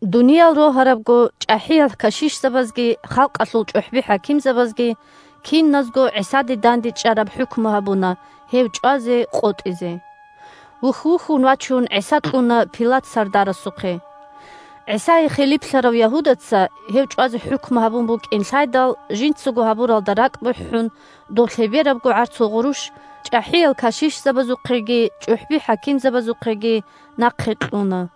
Дуниял рогьарабго, чӀахӀиял кашишзабазги халкъалъул чӀухӀби-хӀакимзабазги – киназго ГӀисада дандечӀараб хӀукму гьабуна гьев чӀвазе къотӀизе. Вухь-вухьун вачун ГӀиса кьуна Пилат сардарасухъе. ГӀисае хилиплъарав Ягьудаца, гьев чӀвазе хӀукму гьабун букӀин лъайдал, жинцаго гьабуралдаса ракӀ бухӀун, доб лъеберабго гӀарцул гъурущ чӀахӀиял кашишзабазухъеги чӀухӀби-хӀакимзабазухъеги нахъе кьуна.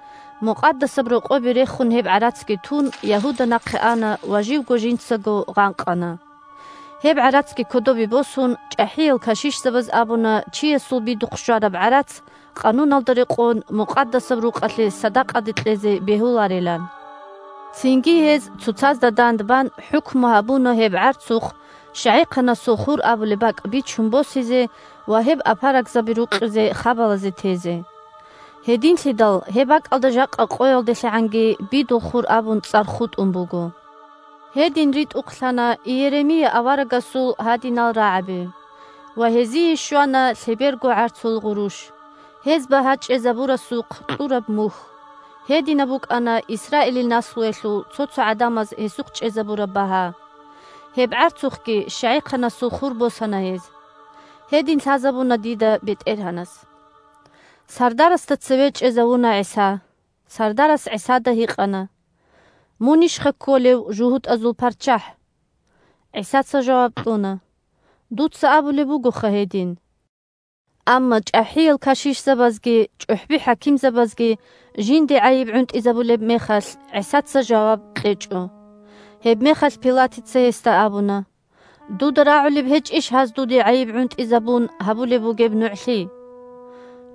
Мукъадасаб Рокъобе рехун гьеб гӀарацги тун, Ягьуда нахъе ана ва живго жинцаго гъанкъана. Гьеб гӀарацги кодобе босун, чӀахӀиял кашишзабаз абуна чиясул бидухъ щвараб гӀарац, Къануналда рекъон, Мукъадасаб Рукъалъе садакъаде кьезе бегьуларилан. Цинги гьез, цоцазда дандбан, хӀукму гьабуна гьеб гӀарцухъ «ЩагӀихъанасул хур» абулеб бакӀ бичун босизе ва гьеб апарагзаби рукъизе хабалазе тезе. Гьединлъидал гьеб бакӀалда жакъа къоялделъагӀанги «Бидул хур» абун цӀар хутӀун буго. Гьедин ритӀухълъана Иеремия аварагасул гьадинал рагӀаби: «Ва гьезие щвана лъеберго гӀарцул гъурущ, гьез багьа чӀезабурасухъ кьураб мухь, гьединаб букӀана Исраилил наслуялъул цо-цо гӀадамаз гьесухъ чӀезабураб багьа. Гьеб гӀарцухъги щагӀихъанасул хур босана гьез. Гьедин лъазабуна дида БетӀергьанас». Сардарасда цеве чӀезавуна ГӀиса. Сардарас ГӀисада гьикъана: – Мунищха кколев жугьутӀазул ПарччахӀ? ГӀисаца жаваб кьуна: – Дуца абулеб бугоха гьедин. Амма чӀахӀиял кашишзабазги чӀухӀби-хӀакимзабазги жинде гӀайиб гӀунтӀизабулеб мехалъ, ГӀисаца жаваб кьечӀо. Гьебмехалъ Пилатица гьесда абуна: – Дуда рагӀулеб гьечӀищ гьаз, дуде гӀайиб гӀунтӀизабун, гьабулеб бугеб нугӀлъи?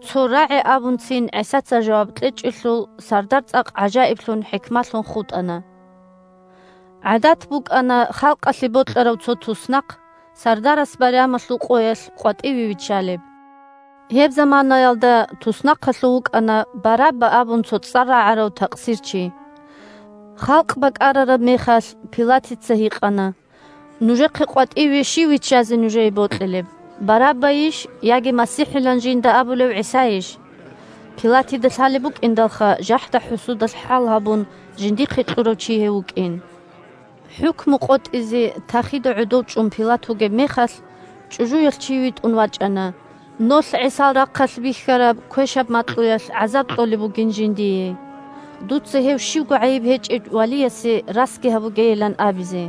Цо рагӀи абунцин ГӀисаца жаваб кьечӀелъул, сардар цӀакъ гӀажаиблъун-хӀикмалъун хутӀана. ГӀадат букӀана халкъалъе бокьарав цо туснахъ сардарас байрамалъул къоялъ къватӀиве виччалеб. Гьеб заманаялда туснахъалъув вукӀана Барабба абун цо цӀар рагӀарав такъсирчи. Халкъ бакӀарараб мехалъ Пилатица гьикъана: – Нужехъе къватӀиве щив виччазе нужее бокьилеб: Бараббайищ яги МасихӀилан жинда абулев ГӀисайищ? (Пилатида лъалеб букӀиндалха жахӀда-хӀусудалъ хӀал гьабун жиндихъе кьурав чи гьев вукӀин.) ХӀукму къотӀизе тахида гӀодов чӀун Пилат вугеб мехалъ, чӀужуялъ чи витӀун вачӀана, нолъ ГӀисал рахъалъ бихьараб квешаб макьуялъ гӀазаб кьолеб бугин жиндие, дуца гьев щибго гӀайиб гьечӀев валиясе расги гьабугейилан абизе.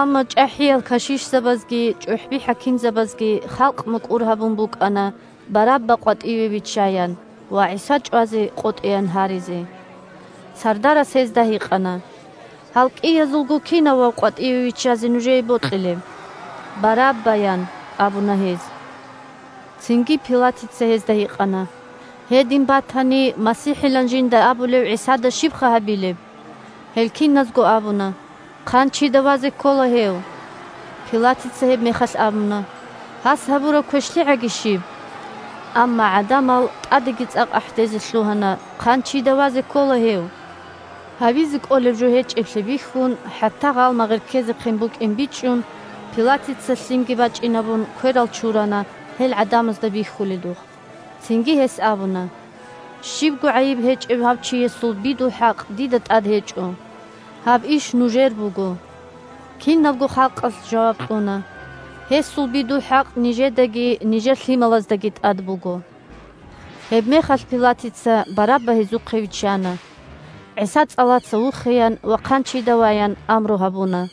Амма чӀахӀиял кашишзабазги чӀухӀби-хӀакимзабазги халкъ мукӀур гьабун букӀана Барабба къватӀиве виччаян ва ГӀиса чӀвазе къотӀеян гьаризе. Сардарас гьезда гьикъана: – Гьел кӀиязулго кинавав къватӀиве виччазе нужее бокьилеб? – Барабба, – ян абуна гьез. Цинги Пилатица гьезда гьикъана: – Гьедин батани, МасихӀилан жинда абулев ГӀисада щибха гьабилеб? Гьел киназго абуна: – Хъанчида вазе ккола гьев! Пилатица гьебмехалъ абуна: – Гьас гьабураб квешлъигӀаги щиб? Амма гӀадамал тӀадеги цӀакъ ахӀдезе лъугьана: – Хъанчида вазе ккола гьев! Гьабизе кӀолеб жо гьечӀеблъи бихьун, хӀатта гъалмагъир ккезехъин букӀин бичӀчӀун, Пилатица, лъимги бачӀинабун, кверал чурана, гьел гӀадамазда бихьуледухъ. Цинги гьес абуна: – Щибго гӀайиб гьечӀев гьав чиясул бидул хӀакъ дида тӀад гьечӀо. Гьаб иш нужер буго. Кинабго халкъалъ жаваб кьуна: – Гьесул бидул хӀакъ нижедаги нижер лъималаздаги тӀад буго. Гьебмехалъ Пилатица Барабба гьезухъе виччана. ГӀиса цӀалаца вухеян ва хъанчида ваян амру гьабуна.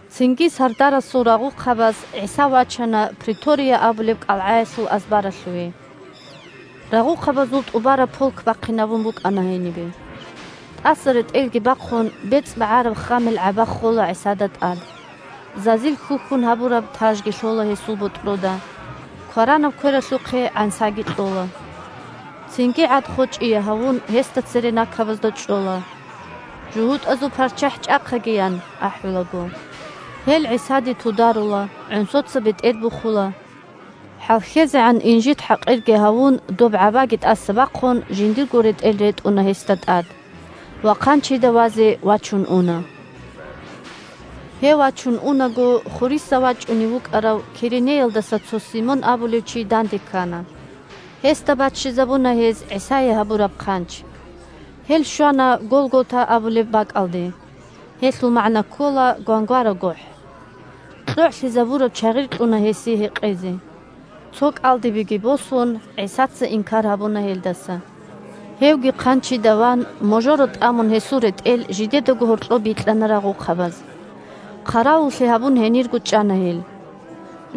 Цинги сардарасул рагъухъабаз ГӀиса вачана претория абулеб кӀалгӀаялъул азбаралъуве. Рагъухъабазул тӀубараб полк бахъинабун букӀана гьенибе. ТӀаса ретӀелги бахъун, бецӀбагӀараб ххамил гӀаба ххола ГӀисада тӀад. Зазил хьухьун гьабураб тажги лъола гьесул ботӀрода, кваранаб квералъухъе гӀансаги кьола. Цинги, гӀад-хочӀие гьавун, гьесда цере накабазда чӀола: «ЖугьутӀазул парччахӀ чӀахъаги!» – ян ахӀулаго. Гьел ГӀисаде тударула, гӀонсоца бетӀер бухула. ХӀалхьезегӀан инжит-хӀакъирги гьавун, доб гӀабаги тӀаса бахъун, жиндирго ретӀел ретӀуна гьесда тӀад. Ва хъанчида вазе вачун уна. Гьев вачун унаго, хуриса вачӀунев вукӀарав Киренеялдаса цо Симон абулев чи данде ккана. Гьесда баччизабуна гьез ГӀисае гьабураб хъанч. Гьел щвана Голгота абулеб бакӀалде. Гьелъул магӀна ккола «Гвангвара гохӀ». КьогӀлъизабураб чагъир кьуна гьесие гьекъезе. Цо кӀалдибеги босун, ГӀисаца инкар гьабуна гьелдаса. Гьевги хъанчида ван, можоро тӀамун гьесул ретӀел жидедаго гьоркьоб бикьана рагъухъабаз. Хъаравуллъи гьабун гьенирго чӀана гьел.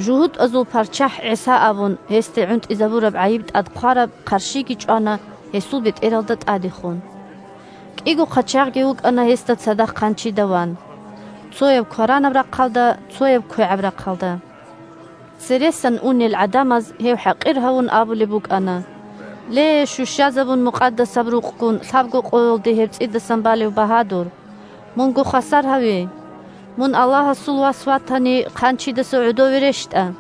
«ЖугьутӀазул парччахӀ ГӀиса», – абун, гьесде гӀунтӀизабураб гӀайиб тӀад хъвараб хъарщиги чӀвана гьесул бетӀералда тӀадехун. КӀиго хъачагъги вукӀана гьесда цадахъ хъанчида ван: цояв кваранаб рахъалда, цояв квегӀаб рахъалда. Цересан унел гӀадамаз, гьев хӀакъир гьавун абулеб букӀана: – Ле, щущазабун Мукъадасаб Рукъгун, лъабго къоялде гьеб цӀидасан балев багьадур, мунго хвасар гьаве! Мун Аллагьасул Вас ватани, хъанчидаса гӀодове рещтӀа!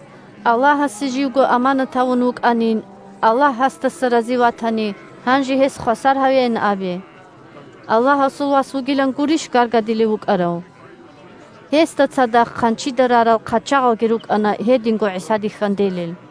Аллагьасе живго аманат гьавун вукӀанин, Аллагь гьасдаса рази ватани, гьанже гьес хвасар гьавеян абе. Аллагьасул Вас вугилан гурищ гаргадилев вукӀарав? Гьесда цадахъ хъанчида рарал хъачагъалги рукӀана гьединго ГӀисаде хьанделел.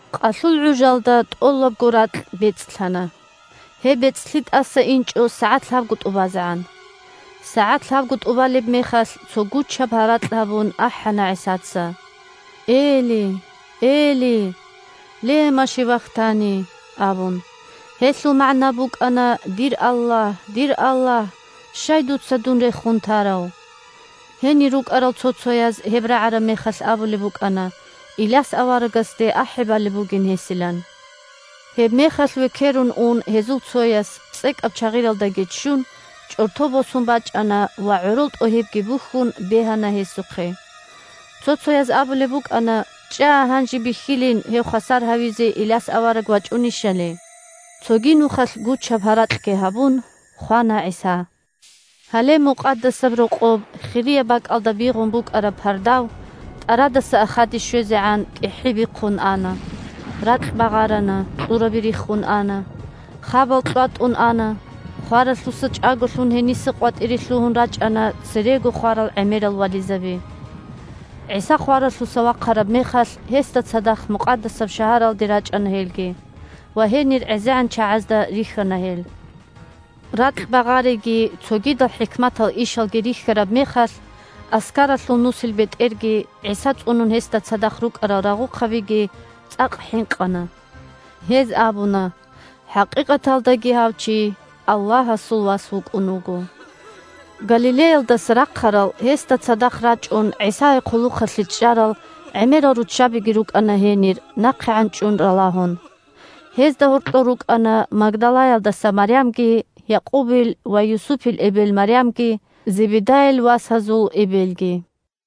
Къалъул гӀужалда тӀолабго ракь бецӀлъана. Гьеб бецӀлъи тӀаса инчӀо сагӀат лъабго тӀубазегӀан. СагӀат лъабго тӀубалеб мехалъ, цо гучаб гьаракь гьабун, ахӀана ГӀисаца: – Эли, Эли! Лема шевактани! – абун. (Гьелъул магӀна букӀана: «Дир Аллагь! Дир Аллагь! Щай дуца дун рехун тарав?») Гьенир рукӀарал цо-цояз, гьеб рагӀараб мехалъ абулеб букӀана Иляс аварагасде ахӀи балеб бугин гьесилан. Гьебмехалъ векерун ун гьезул цояс, цӀекӀаб чагъиралдаги ччун, чӀорто босун бачӀана ва, гӀорол тӀогьибги бухьун, бегьана гьесухъе. Цо-цояз абулеб букӀана: «ЧӀа, гьанже бихьилин гьев хвасар гьавизе Иляс авараг вачӀунищали». Цоги нухалъ гучаб гьаракьги гьабун, хвана ГӀиса. Гьале Мукъадасаб Рокъоб хирияб бакӀалда бигъун букӀараб пардав тӀарадаса ахаде щвезегӀан кӀихӀи бихъун ана, ракь багъарана, кьураби риххун ана, хабал кьватӀун ана, хваралъуса чӀаголъун, гьениса къватӀире лъугьун рачӀана церего хварал гӀемерал вализаби. ГӀиса хваралъуса вахъараб мехалъ, гьесда цадахъ Мукъадасаб шагьаралде Мукъадасаб шагьар, Байтулмукъадас – Иерусалим. рачӀана гьелги, ва гьенир гӀезегӀан чагӀазда рихьана гьел. Ракь багъариги цогидал хӀикматал ишалги рихьараб мехалъ, аскаралъул нусилбетӀерги ГӀиса цӀунун гьесда цадахъ рукӀарал рагъухъабиги цӀакъ хӀинкъана. Гьез абуна: – ХӀакъикъаталдаги гьав чи Аллагьасул Вас вукӀун вуго. Галилеялдаса рахъарал гьесда цадахъ рачӀун, ГӀисае хъулухъалъе чӀарал гӀемерал руччабиги рукӀана гьенир, нахъегӀан чӀун ралагьун. Гьезда гьоркьор рукӀана: Магдалаялдаса Марямги, Якъубил ва Юсупил эбел Марямги, Зебедайил васазул эбелги.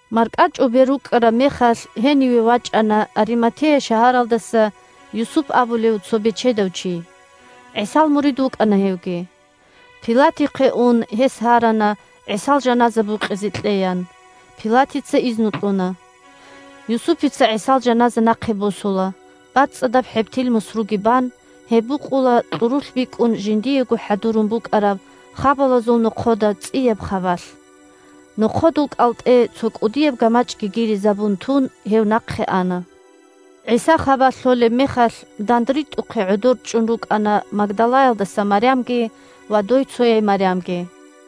МаркӀачӀубер рукӀкӀараб мехалъ, гьениве вачӀана Ариматея шагьаралдаса Юсуп абулев цо бечедав чи. ГӀисал мурид вукӀана гьевги. Пилатихъе ун гьес гьарана ГӀисал жаназа букъизе кьеян. Пилатица изну кьуна. Юсупица ГӀисал жаназа нахъе босула, бацӀцӀадаб хӀебтил мусруги бан, гьеб букъула кьурулъ бикӀун жиндиего хӀадурун букӀараб хабалазул нохъода цӀияб хабалъ. Нохъодул кӀалтӀе цо кӀудияб гамачӀги гиризабун тун, гьев нахъе ана. ГӀиса хабалъ лъолеб мехалъ, дандритӀухъе гӀодорчӀун рукӀана Магдалаялдаса Марямги ва дойцояй Марямги.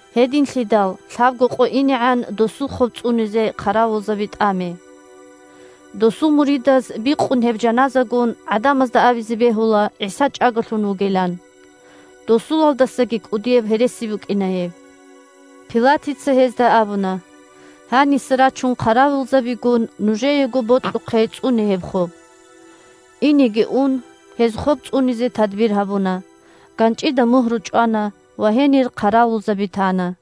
Гьединлъидал лъабго къо инегӀан досул хоб цӀунизе хъаравулзаби тӀаме. Досул муридаз, бикъун гьеб жаназагун, гӀадамазда абизе бегьула ГӀиса чӀаголъун вугилан. Досулалдасаги кӀудияб гьереси букӀина гьеб. Пилатица гьезда абуна: – Гьаниса рачун хъаравулзабигун, нужеего бокьухъе цӀуне гьеб хоб. Инеги ун, гьез хоб цӀунизе тадбир гьабуна: ганчӀида мугьру чӀвана ва гьенир хъаравулзаби тана.